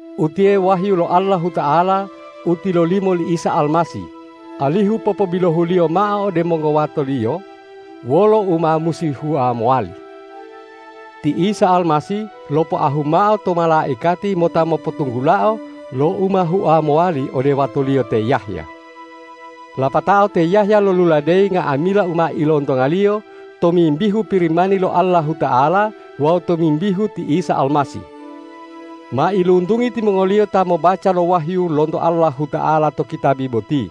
Utiye wahyu lo Allahuta'ala u tilolimo li Isa Almasih, alihu popobilohu-Liyo mao ode mongowato-Liyo wolo u ma musi hua mowali. Ti Isa Almasih lopoahu mao to malaikati mota mopotunggulao lo u ma hua mowali ode wato-Liyo te Yahya. Lapatao te Yahya loluladeyi nga'amila u ma ilontongaliyo tomimbihu Pirimani lo Allahuta'ala wawu tomimbihu ti Isa Almasih. Mailuntungi timongoliyo ta mobaca lo wahyu lonto Allahuta'ala to kitabi boti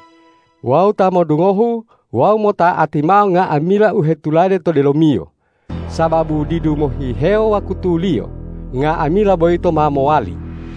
wawu ta modungohu wawu mota'ati mao nga'amila u hetulade to delomiyo, sababu didu mohihewo wakutuliyo, nga'amila boyito ma mowali.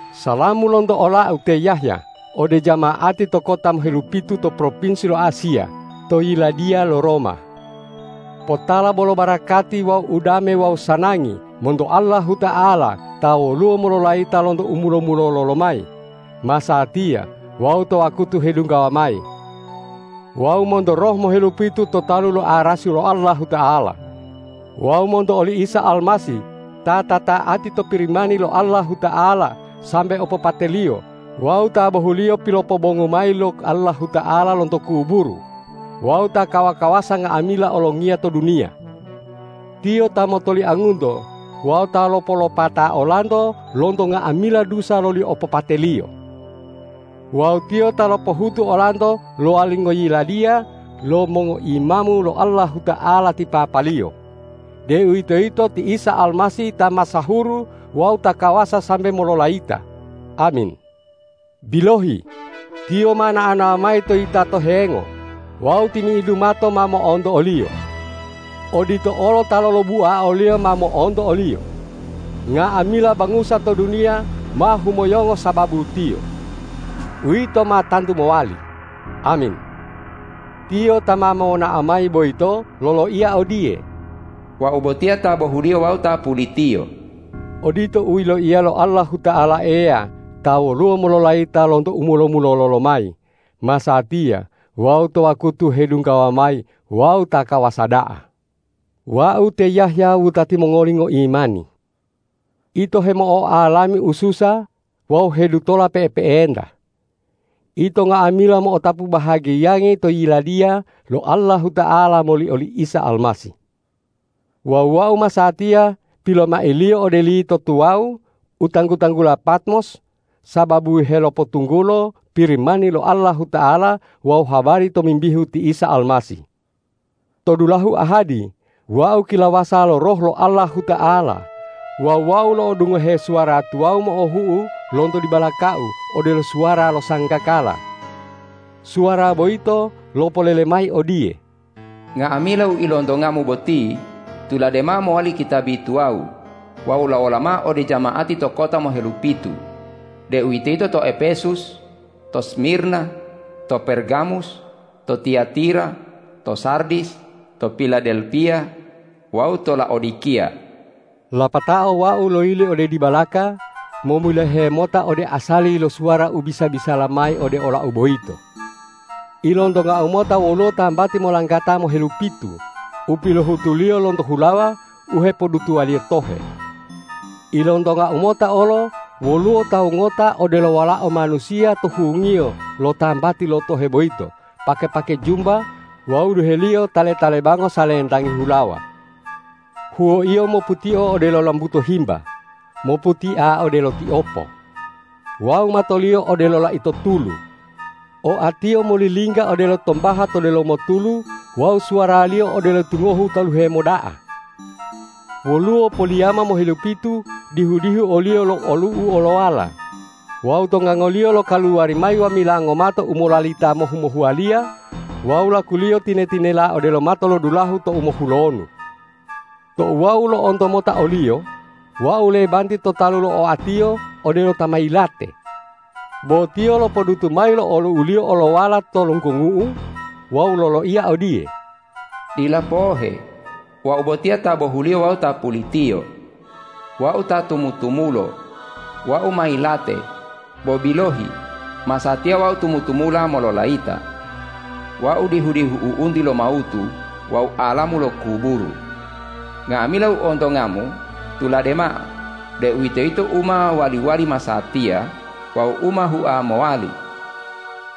Salamu lonto olau te Yahya ode jama'ati to kota mohelupitu to propinsi lo Asiya to yiladiya lo Roma. Potala bolo barakati wawu udame wawu sanangi monto Allahuta'ala ta woluwo mololayita lonto u mulo-mulolo lomayi, masatiya wawu to wakutu hedunggawa mayi. Wawu monto roh mohelupitu to talu lo arasi lo Allahuta'ala. Wawu monto oli Isa Almasih ta ta'ati to Pirimani lo Allahuta'ala sambe opopate-Liyo wawu ta bohuliyo pilopobongu mayi lo Allahuta'ala lonto kuburu wawu ta kawa-kawasa nga'amila olongiya to duniya. Tiyo ta motoliangunto wawu ta lopolopata olanto lonto nga'amila dusa loli opopate-Liyo. Wawu Tiyo ta lopohutu olanto lowali ngoyiladiya lo mongoimamu lo Allahuta'ala ti Papa-Liyo, deuwitoyito ti Isa Almasih ta masahuru wawu ta kawasa sambe mololayita! Amin. Bilohi, Tiyo ma nao-nao mayi to yitato hengo wawu timi'idu mato ma mo'onto o-Liyo. Odito olo ta lolobua o-Liyo ma mo'onto o-Liyo. Nga'amila bangusa to duniya ma humoyongo sababu Tiyo. Uwito ma tantu mowali! Amin. Tiyo ta ma monao mayi boyito loloiya odiye,”Wau botiya ta bohuliyo wawu ta pulitiyo.” Odito u yiloiya lo Allahuta'ala Eya ta woluwo mololayita lonto u mulo-mulolo lomayi, masatiya wawu to wakutu hedunggawa mayi wawu ta kawasa da'a. Wau te Yahya wutati mongoli ngoimani. Ito hemo'oalami ususa wawu hedutola pe'epe'enta. Ito nga'amila mo'otapu bahagiyangi to Yiladiya lo Allahuta'ala moli oli Isa Almasih. Wawu wau masatiya pilomailiyo ode lito tuwawu u tanggu-tanggula Patmos sababu helopotunggulo Pirimani lo Allahuta'ala wawu habari tomimbihu ti Isa Almasih. To dulahu ahadi wau kilawasa lo Roh lo Allahuta'ala wawu wau lo'odungohe suwara tuwawu mo'ohu'u lonto dibalakau odelo suwara lo sanggakala. Suwara boyito lopolele mayi odiye,”Nga'amila u ilontongamu boti tulade mao mowali kitabi tuwawu wawu lawola mao ode jama'ati to kota mohelupitu, deuwitoyito to Epesus, to Smirna, to Pergamus, to Tiyatira, to Sardis, to Piladelpiya wawu to Laodikiya.” Lapatao wau loyili ode dibalaka momilohe mota ode asali lo suwara u bisa-bisala mayi ode olau boyito. Ilontongau mota woluwo tambati molanggata mohelupitu u pilohutuliyo lonto hulawa u hepodutuwaliyo tohe. Ilontongau mota olo woluwo tawu ngota odelo Walao Manusiya to hungiyo lo tambati lo tohe boyito pake-pake jumba wawu duhe-Liyo tale-talebango salentangi hulawa. Huwo-Iyo moputio odelo lambuto himba, moputia odelo tiopo. Wawu mato-Liyo odelo laito tulu. Oa-Tiyo molilingga odelo tombaha to delomo tulu wawu suwara-Liyo odelo tingohu taluhe moda'a. Woluwo poliyama mohelupitu dihu-dihu o-Liyo lo olu'u olowala, wawu to ngango-Liyo lokaluwari mayi wamila ngomato u molalita mohu-mohuwaliya wawu laku-Liyo tine-tinela odelo matolodulahu tou mohulonu. Tou wau lo'onto mota o-Liyo, wau lebanti to talu lo oa-Tiyo odelo ta ma yilate. Bo Tiyo lopodutu mayi lo olu'u-Liyo olowala to lunggongu'u wawu loloiya odiye,”Dila pohe! Wau botiya ta bohuliyo wawu ta pulitiyo. Wau ta tumu-tumulo! Wau ma yilate; bo bilohi, masatiya Wau tumu-tumula mololayita. Wau dihu-dihu u'unti lo mawutu wawu alamu lo kuburu. Nga'amila u ontongamu tulade mao, deuwitoyito u ma wali-wali masatiya wawu u ma hua mowali.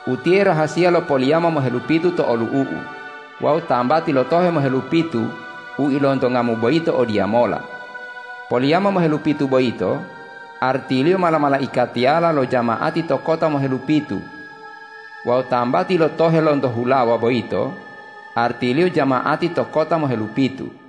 Utiye rahasiya lo poliyama mohelupitu to olu'u-U wawu tambati lo tohe mohelupitu u ilontongamu boyito odiyamola: Poliyama mohelupitu boyito artiliyo mala-malaikatiyala lo jama'ati to kota mohelupitu wawu tambati lo tohe lonto hulawa boyito artiliyo jama'ati to kota mohelupitu.”